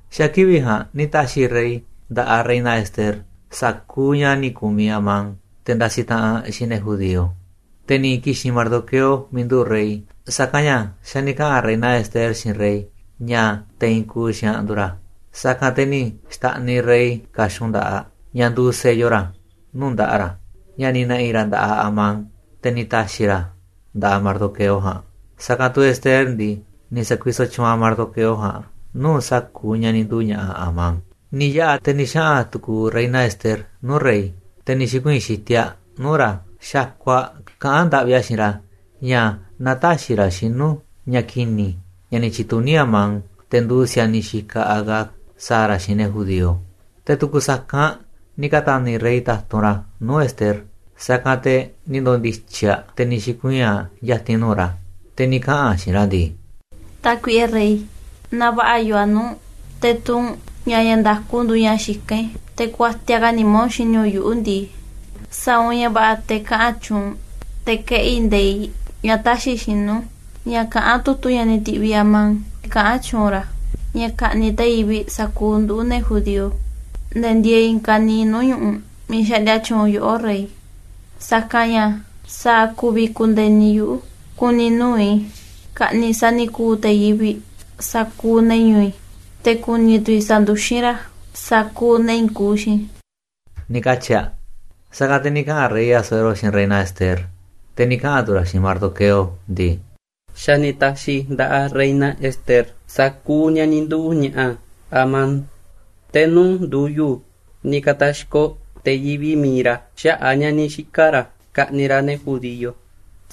Xa̱ kivi̱ꞌ ja̱a̱nꞌ ni̱ ta̱xi̱ rey nda̱ꞌaꞌ reina Ester sa̱kuuꞌ ña̱ ni̱ ku̱miꞌ Amán, te̱ ndasiꞌ taꞌanꞌ xiinꞌ ne̱ judío. Te̱ ni̱ ki̱xi̱n Mardoqueo miiꞌ nduꞌu̱ꞌ rey, sa̱kanꞌ ña̱ xa̱ ni̱ kaꞌa̱n reina Ester xiinꞌ rey ña̱ te̱ i̱i̱n kuuꞌ xiinꞌ aꞌ nduuꞌ ra̱. Sa̱kanꞌ te̱ ni̱ xta̱ꞌniꞌ rey ka̱xun nda̱ꞌaꞌ, ña̱ nduuꞌ sello ra̱, nuu̱ꞌ nda̱ꞌaꞌ ra̱, ña̱ ni̱ na̱ꞌi̱ ra̱ nda̱ꞌaꞌ Amán, te̱ ni̱ ta̱xi̱ ra̱ a̱ nda̱ꞌaꞌ Mardoqueo ja̱a̱nꞌ. Sa̱kanꞌ tu̱ Ester ndii, ni̱ sa̱kuisoꞌ tyuunꞌ aꞌ Mardoqueo ja̱a̱nꞌ nuu̱ꞌ sa̱kuuꞌ ña̱ ni̱ nduu̱ ña̱ꞌa̱ Amán. Ni̱ yaꞌa̱ te̱ ni̱ xaꞌa̱n tu̱ku̱u̱ reina Ester nuu̱ꞌ rey, te̱ ni̱ xi̱kuii̱n xitiꞌ aꞌ nuu̱ꞌ ra̱ xakuꞌ aꞌ kaꞌán ndaꞌvi aꞌ xiinꞌ ra̱ ña̱ na tä̱xi̱ ra̱ xinu̱ ña̱ ki̱ni̱ ña̱ ni̱ tyi̱tuní Amán, te̱ nduuꞌ si̱a̱niꞌ xikaꞌ Agag, sa̱a̱ ra̱ xiinꞌ ne̱ judío. Te̱ tu̱ku̱ sa̱kanꞌ ni̱ ka̱ta̱ni̱ rey ta̱tunꞌ ra̱ nuu̱ꞌ Ester, sa̱kanꞌ te̱ ni̱ ndo̱ndi̱tyi̱ aꞌ, te̱ ni̱ xi̱kuii̱n aꞌ ya̱ti̱n nuu̱ꞌ ra̱. Te̱ ni̱ kaꞌa̱n aꞌ xiinꞌ ra̱ ndii: ―Tákuiꞌe rey, naaꞌ va̱ꞌa̱ yoo a̱ nuu̱ꞌ u̱nꞌ, te̱ tuu u̱nꞌ ña̱ ña̱ nda̱ku nduuꞌ ña̱ xikán i̱, te̱ kuatiaꞌ ka̱ nimá u̱nꞌ xini u̱nꞌ yuꞌu̱ ndii, sa̱a̱ u̱nꞌ ña̱ va̱ꞌa̱ te̱ kaꞌa̱n tyuunꞌ u̱nꞌ te̱ keꞌi̱ nde̱iꞌ ña̱ tä̱xi̱ xinu̱ ña̱ kaꞌán tu̱tu̱ ña̱ ni̱ ti̱ꞌviꞌ Amán, miiꞌ kaꞌán tyuunꞌ ra̱ ña̱ ka̱ꞌni̱ꞌ te̱ yivi̱ꞌ sa̱kuuꞌ nduꞌu̱, ne̱ judío, ne̱ ndieeꞌ i̱i̱n ka̱niiꞌ nuu̱ꞌ ñu̱ꞌuꞌ miiꞌ xaꞌndia tyuunꞌ yoꞌó, rey. Sa̱kanꞌ ña̱ ¿sa̱a̱ ku̱vi̱ ku̱ndi̱e̱ni yuꞌu̱ ku̱ni̱ nuu̱ꞌ i̱ ka̱ꞌni̱ꞌ sa̱ni̱ku̱u̱ te̱ yivi̱ꞌ sa̱kuuꞌ ne̱ ñu̱u̱ i̱, te̱ ku̱ni̱ tu̱ i̱ sa̱nduxín ra̱ sa̱kuuꞌ ne̱ i̱i̱n kuuꞌ xiinꞌ i̱? ―ni̱ katyi̱ aꞌ. Sa̱kanꞌ te̱ ni̱ kaꞌa̱n rey Asuero xiinꞌ reina Ester, te̱ ni̱ kaꞌa̱n tu̱ ra̱ xiinꞌ Mardoqueo ndii: ―Xa̱ ni̱ ta̱xi̱ i̱ nda̱ꞌaꞌ reina Ester sa̱kuuꞌ ña̱ ni̱ nduu̱ ña̱ꞌa̱ Amán, te̱ nuu̱ꞌ ndu̱yu̱ ni̱ ka̱ta̱xkoꞌ te̱ yivi̱ꞌ mi̱iꞌ ra̱ xaꞌa̱ꞌ a̱ ña̱ ni̱ xika̱ ra̱ ka̱ꞌni̱ꞌ ra̱ ne̱ judío.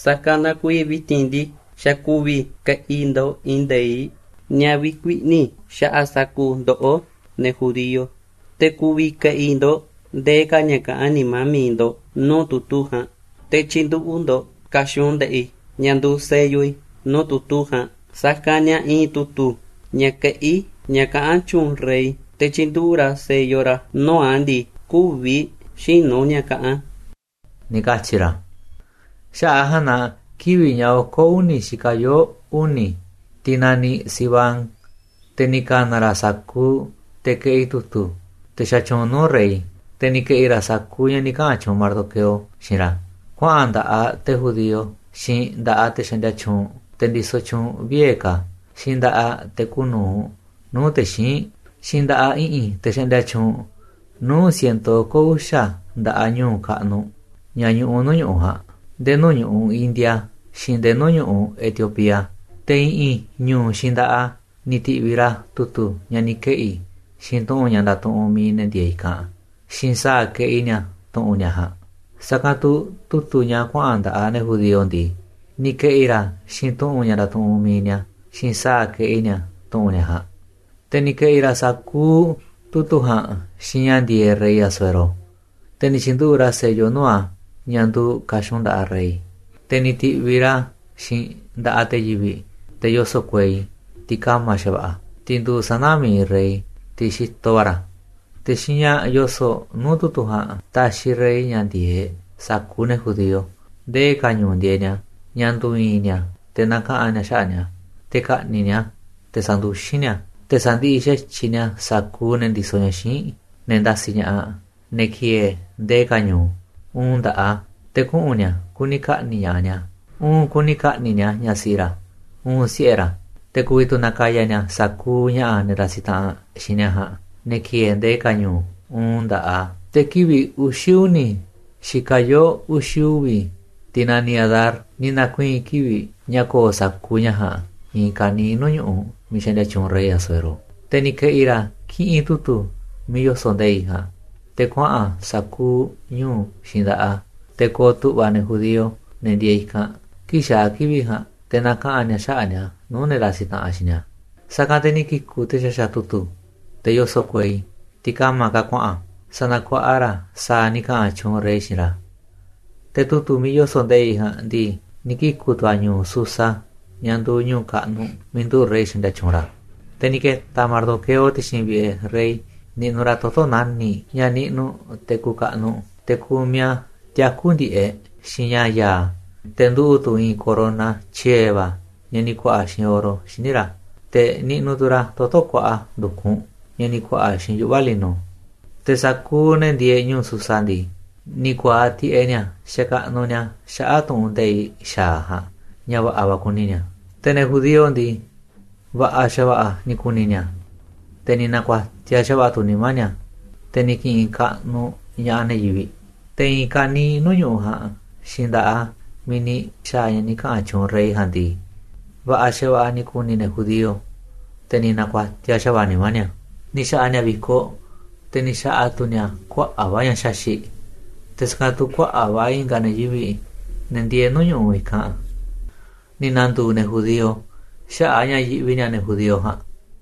Sa̱kanꞌ na kuiiꞌ vi̱ti̱n ndii, xa̱ ku̱vi̱ ke̱ꞌi̱ ndo̱ꞌ i̱i̱n nde̱iꞌ ña̱ vi̱kuiꞌni̱ xaꞌa̱ꞌ sa̱kuuꞌ ndoꞌó, ne̱ judío. Te̱ ku̱vi̱ ke̱ꞌi̱ ndo̱ꞌ ndee ka̱ ña̱ kaꞌán nimá mi̱iꞌ ndo̱ꞌ nuu̱ꞌ tu̱tu̱ ja̱a̱nꞌ, te̱ tyi̱nduꞌu̱ꞌ ndo̱ꞌ ka̱xun nda̱ꞌaꞌ i̱, ña̱ nduuꞌ sello i̱ nuu̱ꞌ tu̱tu̱ ja̱a̱nꞌ. Sa̱kanꞌ ña̱ i̱i̱n tu̱tu̱ ña̱ keꞌí ña̱ kaꞌán tyuunꞌ rey, te̱ tyinduꞌu̱ꞌ ra̱ sello ra̱ nuu̱ꞌ a̱ ndii, kü̱vi̱ xïnu̱ ña̱ kaꞌán a̱ ―ni̱ katyi̱ ra̱. Xaꞌa̱ꞌ a̱ ja̱a̱nꞌ na kivi̱ꞌ ña̱ oko̱ uni̱ xikaꞌ yoo̱ uni̱, tiꞌ naniꞌ Siván, te̱ ni̱ ka̱na̱ ra̱ sa̱kuuꞌ te̱ keꞌi tu̱tu̱, te̱ xatyuunꞌ nuu̱ꞌ rey. Te̱ ni̱ ke̱ꞌi̱ ra̱ sa̱kuuꞌ ña̱ ni̱ kaꞌa̱n tyuunꞌ Mardoqueo xiinꞌ ra̱ kuaꞌa̱n nda̱ꞌaꞌ te̱ nduuꞌ te̱ judío, xiinꞌ nda̱ꞌaꞌ te̱ xaꞌndia tyuunꞌ, te̱ ndisoꞌ tyuunꞌ vie̱ ka̱, xiinꞌ nda̱ꞌaꞌ te̱ kuuꞌ nu̱uꞌ nuu̱ꞌ te̱ xíinꞌ, xiinꞌ nda̱ꞌaꞌ i̱ꞌi̱n te̱ xaꞌndia tyuunꞌ nuu̱ꞌ ciento oko̱ uxa̱ nda̱ꞌaꞌ ñu̱u̱ kaꞌnuꞌ, ña̱ ñuꞌuꞌ nuu̱ꞌ ñu̱ꞌuꞌ ja̱a̱nꞌ, nde̱e̱ nuu̱ꞌ ñu̱ꞌuꞌ India, xiinꞌ nde̱e̱ nuu̱ꞌ ñu̱ꞌuꞌ Etiopía. Te̱ i̱ꞌi̱n ñu̱u̱ xiinꞌ nda̱ꞌaꞌ a̱ ni̱ ti̱ꞌviꞌ ra̱ tu̱tu̱ ña̱ ni̱ keꞌi̱ xiinꞌ tu̱ꞌu̱n ña̱ ndatuꞌunꞌ mi̱iꞌ ne̱ ndieeꞌ i̱kanꞌ xiinꞌ sa̱a̱ keꞌi ni̱a̱ tu̱ꞌu̱n ni̱a̱ ja̱a̱nꞌ. Sa̱kanꞌ tu̱ tu̱tu̱ ña̱ kuaꞌa̱n nda̱ꞌaꞌ ne̱ judío ndii, ni̱ ke̱ꞌi̱ ra̱ a̱ xiinꞌ tu̱ꞌu̱n ña̱ ndatuꞌunꞌ mi̱iꞌ ni̱a̱ xiinꞌ sa̱a̱ keꞌiꞌ ni̱a̱ tu̱ꞌu̱n ni̱a̱ ja̱a̱nꞌ. Te̱ ni̱ ke̱ꞌi̱ ra̱ sa̱kuuꞌ tu̱tu̱ ja̱a̱nꞌ xiinꞌ ña̱ ndi̱e̱eꞌ rey Asuero, te̱ ni̱ tyi̱nduꞌu̱ꞌ ra̱ sello nuu̱ꞌ a̱ ña̱ nduuꞌ ka̱xun nda̱ꞌaꞌ rey. Te̱ ni̱ ti̱ꞌviꞌ ra̱ a̱ xiinꞌ nda̱ꞌaꞌ te̱ yivi̱ꞌ, te̱ yoso̱ꞌ kuei, tiꞌ ka̱ma̱ xa̱va̱ꞌa̱, tiꞌ nduuꞌ sana̱ mi̱iꞌ rey, tiꞌ xitoꞌ va̱ ra̱. Te̱ xiinꞌ ña̱ yoso̱ꞌ nuu̱ꞌ tu̱tu̱ ja̱a̱nꞌ taxiꞌ rey ña̱ ndi̱e̱eꞌ sa̱kuuꞌ ne̱ judío ndee ka̱ ñu̱u̱ ndieeꞌ ni̱a̱, ña̱ ndu̱i̱i̱n ni̱a̱ te̱ na̱kaꞌa̱n ni̱a̱ xaꞌa̱ꞌ ni̱a̱, te̱ ka̱ꞌni̱ꞌ ni̱a̱, te̱ sa̱nduxín ni̱a̱, te̱ sa̱ndiꞌiꞌ xa̱tyiꞌ ni̱a̱ sa̱kuuꞌ ne̱ ndisoꞌ ña̱ xíinꞌ, ne̱ ndasiꞌ ña̱ꞌaꞌ ne̱ ki̱e̱e̱ ndee ka̱ ñu̱u̱, uun nda̱ꞌaꞌ a̱. Te̱ kuꞌu̱n ni̱a̱ kuni ka̱ꞌni̱ꞌ ña̱ꞌaꞌ ni̱a̱, uun kuni ka̱ꞌni̱ꞌ ni̱a̱ ñaꞌ siꞌi ra̱, uun siꞌe̱ ra̱. Te̱ ku̱vi̱ tu̱ na̱ka̱ya̱ ni̱a̱ sa̱kuuꞌ ña̱ꞌa̱ ne̱ ndasiꞌ taꞌanꞌ xiinꞌ ni̱a̱ ja̱a̱nꞌ, ne̱ ki̱e̱e̱ ndee ka̱ ñu̱u̱ uun nda̱ꞌaꞌ a̱. Te̱ kivi̱ꞌ uxi̱ uni̱ xikaꞌ yoo̱ uxi̱ uvi̱, tiꞌ naniꞌ Adar, ni̱ na̱kuii̱n kivi̱ꞌ ña̱ ko̱o̱ sa̱kuuꞌ ña̱ ja̱a̱nꞌ i̱i̱n ka̱niiꞌ nuu̱ꞌ ñu̱ꞌuꞌ miiꞌ xaꞌndia tyuunꞌ rey Asuero. Te̱ ni̱ ke̱ꞌi̱ ra̱ kiꞌinꞌ tu̱tu̱ miiꞌ yoso̱ꞌ nde̱iꞌ ja̱a̱nꞌ te̱ kuaꞌa̱n a̱ sa̱kuuꞌ ñu̱u̱ xiinꞌ nda̱ꞌaꞌ a̱, te̱ ko̱o̱ tu̱ꞌva̱ ne̱ judío, ne̱ ndieeꞌ i̱kanꞌ, kii̱ꞌ xaa̱ kivi̱ꞌ ja̱a̱nꞌ, te̱ na̱kaꞌa̱n ni̱a̱ xaꞌa̱ꞌ ni̱a̱ nuu̱ꞌ ne̱ ndasiꞌ taꞌanꞌ xiinꞌ ni̱a̱. Sa̱kanꞌ te̱ ni̱ kiku̱ te̱ xaxa̱ꞌ tu̱tu̱, te̱ yoso̱ꞌ kuei, tiꞌ ka̱ma̱ ka̱ kuaꞌa̱n, sa̱na̱kuaꞌa ra̱ a̱ sa̱a̱ ni̱ kaꞌa̱n tyuunꞌ rey xiinꞌ ra̱. Te̱ tu̱tu̱ miiꞌ yoso̱ꞌ nde̱iꞌ ja̱a̱nꞌ ndii, ni̱ kiku̱ tu̱ a̱ ñu̱u̱ Susa, ña̱ nduuꞌ ñu̱u̱ kaꞌnuꞌ miiꞌ nduꞌu̱ꞌ rey xaꞌndia tyuunꞌ ra̱. Te̱ ni̱ ke̱ta̱ Mardoqueo ti̱xi̱n vi̱ꞌe̱ rey niꞌnuꞌ ra̱ toto̱ nani̱ꞌ, ña̱ niꞌnuꞌ te̱ kuuꞌ kaꞌnuꞌ. Te̱ kumiꞌ a̱ tiaku̱ ndi̱ꞌeꞌ xiinꞌ ña̱ ya̱a̱, te̱ nduꞌu̱ꞌ tu̱ i̱i̱n corona tyiee̱ va̱ ña̱ ni̱ ku̱a̱ꞌa̱ xiinꞌ oro xíniꞌ ra̱, te̱ niꞌnuꞌ tu̱ ra̱ toto̱ kuaꞌa ndu̱kunꞌ, ña̱ ni̱ ku̱a̱ꞌa̱ xiinꞌ yuꞌva̱ lino. Te̱ sa̱kuuꞌ ne̱ ndieeꞌ ñu̱u̱ Susa ndii, ni̱ ku̱a̱aꞌ tiꞌeꞌ ni̱a̱ xakaꞌnuꞌ ni̱a̱ xaꞌa̱ꞌ tu̱ꞌu̱n nde̱iꞌ xa̱aꞌ ja̱a̱nꞌ ña̱ va̱ꞌa̱ kuni ni̱a̱. Te̱ ne̱ judío ndii, va̱ꞌa̱ xa̱va̱ꞌa̱ ni̱ ku̱ni̱ ni̱a̱, te̱ ni̱ na̱ku̱a̱tiaꞌ xa̱va̱ꞌa̱ tu̱ nimá ni̱a̱, te̱ ni̱ ki̱ꞌi̱n kaꞌnuꞌ ña̱ꞌaꞌ ne̱ yivi̱ꞌ. Te̱ i̱i̱n ka̱niiꞌ nuu̱ꞌ ñu̱ꞌuꞌ ja̱a̱nꞌ xiinꞌ nda̱ꞌaꞌ a̱ miiꞌ ni̱ xa̱a̱ ña̱ ni̱ kaꞌa̱n tyuunꞌ rey ja̱a̱nꞌ ndii, va̱ꞌa̱ xa̱va̱ꞌa̱ ni̱ ku̱ni̱ ne̱ judío, te̱ ni̱ na̱ku̱a̱tiaꞌ xa̱va̱ꞌa̱ nimá ni̱a̱, ni̱ xa̱ꞌa̱ ni̱a̱ vi̱koꞌ, te̱ ni̱ xa̱ꞌa̱ tu̱ ni̱a̱ kuaꞌa̱ꞌ va̱ ña̱ xaxi̱ꞌ. Te̱ sa̱kanꞌ tu̱ kuaꞌa̱ꞌ va̱ i̱nga̱ ne̱ yivi̱ꞌ, ne̱ ndieeꞌ nuu̱ꞌ ñu̱ꞌuꞌ i̱kanꞌ, ni̱ na̱ndu̱u̱ ne̱ judío xaꞌa̱ꞌ a̱ ña̱ yiꞌvi ni̱a̱ ne̱ judío ja̱a̱nꞌ.